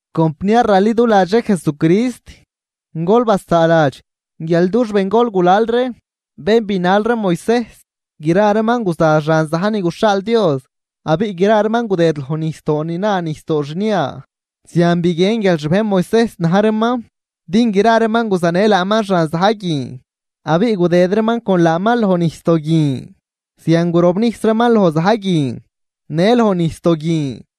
Compniar raliduladx ree Jesucrist, gol basaaladx guial dux bengol gulal ree bén binal ree Moisejs, gra reeman guza xan za̱j ni guxhaal Dios abiꞌ gra reeman gudëd loj nijsdoo ni la nijsdoo xnia. Zian biguien guial xbejn Moisejs na̱j reeman din gra reeman guzanë laaman xan za̱j guin, abiꞌ gudëd reeman con laaman loj nijsdoo guin. Zian gurobnijs reeman loj za̱j guin në loj nijsdoo guin.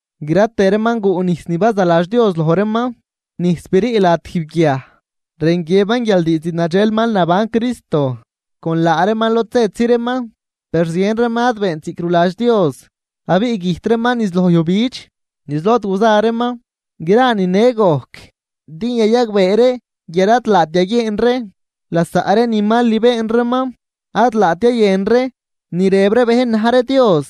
Gra tëë reeman guꞌ nijs ni bazaladx Dios loj reeman, nijs brii lad tijb guiaj. Rën guiëban guial diizd nadxel mal naban Cristo con laa reeman lod zëtzi reeman. Per zien reeman ad beent ziꞌc ruladx Dios, abiꞌ güjt reeman niz loj yujbidx niz lod guza reeman. Gra nine gojc din yayagbee ree guial ad laat yaguieen ree lasaꞌ ree ni mal ni been reeman. Ad rayalt yayën ree ni rëb ree bejn na̱j ree Dios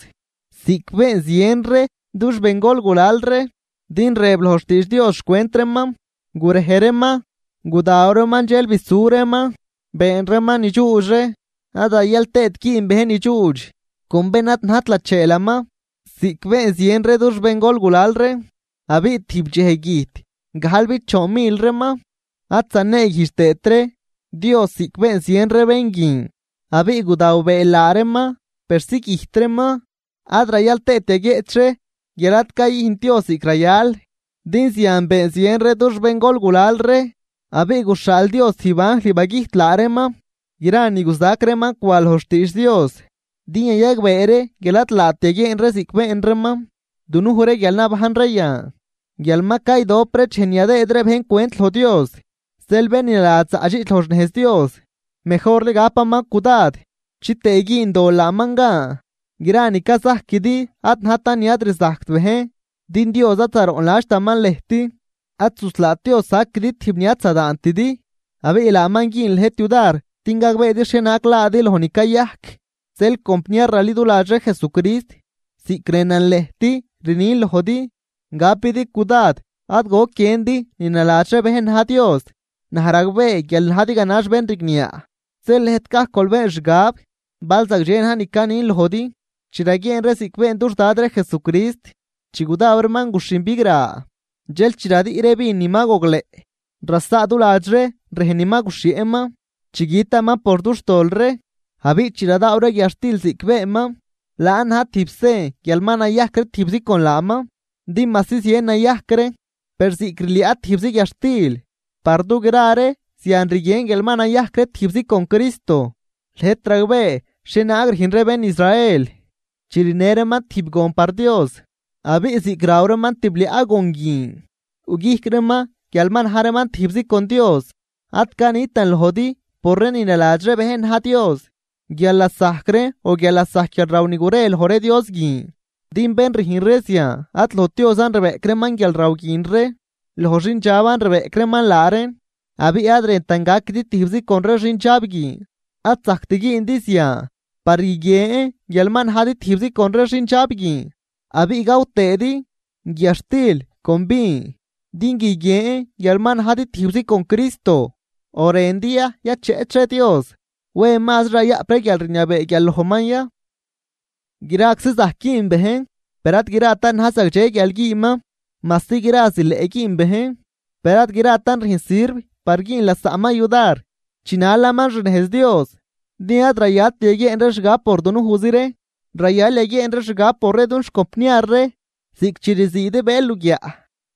ziꞌc been zien ree dux bengol gulal ree, din rëb loj xtiidx Dios xcwent reeman: “Gurej reeman, gudaw reeman dxel bisu reeman been reeman ni dxuudx ree.” Ad rayal tëët güün bejn ni dxuudx con bén ad najt lacheelaman, ziꞌc been zien ree dux bengol gulal ree abiꞌ tijb dxej güjt gajlbichoon mil reeman. Ad zaneeguijdx tëët ree Dios ziꞌc been zien ree bén guin, abiꞌ gudaw bëël laa reeman persi güjt reeman. Ad rayal tëët yaguieꞌch ree guial ad cayüjnt Dios ziꞌc rayal, din zian been zien ree dux bengol gulal ree abiꞌ guxhaal Dios tijb anjl bagüjt laa reeman. Gra ni guzac reeman cwan loj xtiidx Dios din yayagbee ree guial ad laat yaguieen ree ziꞌc been reeman, dunuj ree guial nabajn ree yan guial ma caydop dxej ni yadëëd ree bejn cwent loj Dios. Zeel bén ni naladx zaꞌdxiꞌch loj xnejz Dios, mejorli gapaman cudad chitëë güün dol laaman gan. Gra ni cazajquidi ad najtan ni ad rzajct bejn, din Dios ad zaroꞌnladxtaman lëjt. Ad zuslaat Dios saquidi tijb ni ad zadaantidi, abiꞌ laaman güün lëjt yudar din gagbeedi xhienaag laadi loj ni cayajc. Zeel compniar raliduladx ree Jesucrist, ziꞌc rënan lëjt rnin lojdi gapidi cudad ad goc guiëndi ni naladx ree bejn na̱j dios. Naj ragbee guial najdi ganax bén rigniaꞌ, zeel lëjt gajc gol been xgab bal zagdxe na̱j ni canin lojdi. Chi raguieen ree ziꞌc been dux Dad ree Jesucrist chi gudaw reeman guxhin bigra, dxel chi radüꞌ ree vin ni ma gogleꞌ rasaaduladx ree rejn ni ma guxhieꞌman chi gütaman por dux tol ree. Abiꞌ chi radaaw ree guiadxtil ziꞌc beenman, laan na̱j tijb sen guial ma nayajc ree tijbzi con laaman. Din majsi zien nayajc ree, per ziꞌc rliaꞌ tijbzi guiadxtil par dugra ree, zian rguien guial ma nayajc ree tijbzi con Cristo. Lëjt ragbee xhienaag rüjn ree bén Israel chi rinë reeman tijb gon par Dios, abiꞌ ziꞌc raw reeman tibliaꞌ gon guin yuꞌguijc reeman guial ma na̱j reeman tijbzi con Dios. Ad canitan lojdi por ree ni naladx ree bejn na̱j dios guial lasajc reen o guial lasajc guialraw ni gurej loj ree dios guin. Din bén rüjn ree zian ad lojt Diosan rbeꞌc reeman guialraw guin ree, loj xindxaban rbeꞌc reeman laa reen. Abiꞌ ad rëntan gaquidi tijbzi con ree xindxab guin. Ad zacjt güündi zian par guiguien guial ma najdi tijbzi con ree xindxab guin, abiꞌ gaw tëëdi guiadxtil con vin din guiguien guial ma najdi tijbzi con Cristo. ¿O rëndi ya yacheꞌch ree Dios? ¿Wen mazri rayaꞌp ree guialrniabee guial lojman ya? Graczi zajc güün bejn, per ad gratan na̱j zagdxe guial güünman. Majsi gra zileꞌ güün bejn, per ad gratan rüjn sirv par güün lasaꞌman yudar chinalaman xnejz Dios. Din ad rayalt yaguieen ree xgab por dunujzi ree, rayal yaguieen ree xgab por ree dux compniar ree. Ziꞌc chi rziidi bëël luguiaꞌ,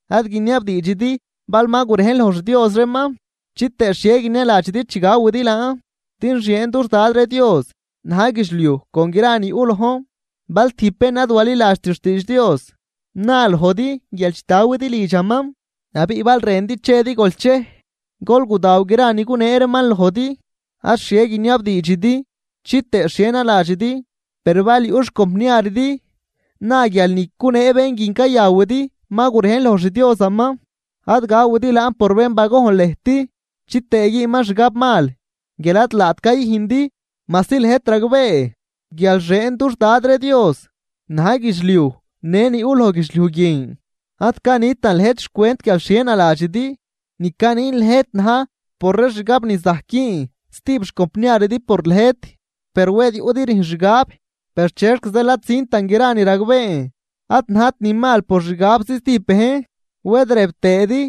ad guiniabdiidxidi bal ma gurejn loj xdios reeman, chitëë xhie guinialadxidi chi gawidi laan. Din xieen dux Dad ree Dios na̱j guidxliuj con gra ni yuꞌ lojn. Bal tijb bén ad waliladxt xtiidx Dios na lojdi guial chitawidi lidxaman, abiꞌ bal rëndi chedi gol chej. Gol gudaw gra ni gunee reeman lojdi ad xhie guiniabdiidxidi chitëë xhie naladxidi. Per bal yuꞌ xcompniaridi na guial ni cunee bén guin cayawidi ma gurejn loj xdiosaman, ad gawidi laan por bén bagojn lëjt chitëë güünman xgab mal guial ad laat cayüjndi, majsi lëjt ragbee guial xieen dux Dad ree Dios na̱j guidxliuj në ni yuꞌ loj guidxliuj guin. Ad canitan lëjt xcwent guial xhie naladxidi, ni canin lëjt na̱j por ree xgab ni zajc güün stijb xcompniaridi por lëjt. Per wed yuꞌdi rüjn xgab: “Per, ¿chexc zeel ad züntan gra ni ragbeen ad najt ni mal por xixgabzi stijb bejn? Wed rëb tëëdi: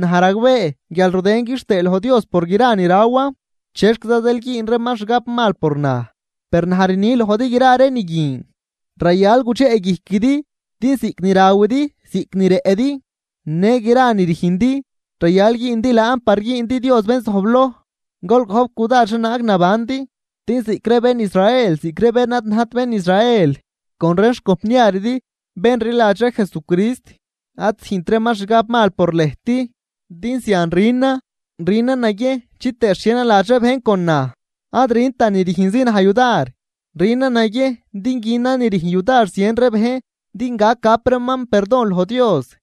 Naj ragbee guial rudën quixtëë loj Dios por gra ni rawan, ¿chexquiza zeel güün reeman xgab mal por naj?” Per naj rni lojdi gra ree ni guin rayal gudxeꞌguijquidi din ziꞌc ni rawidi ziꞌc ni rëꞌdi në gra ree ni rüjndi rayal güündi laan par güündi Dios bén zojbloj. Gol gojp cudad xhienaag nabandi din ziꞌc ree bén Israel ziꞌc ree bén ni ad najt bén Israel con ree xcompniaridi bén rliladx ree Jesucrist ad züjnt reeman xgab mal por lëjt. Din zian rünan, rünan naguiejn chitëë xhie naladx bejn con naj. Ad rüntan ni rüjnzi naj yudar, rünan naguiejn din günan ni rüjn yudar zien ree bejn din gac gap reeman perdon loj Dios.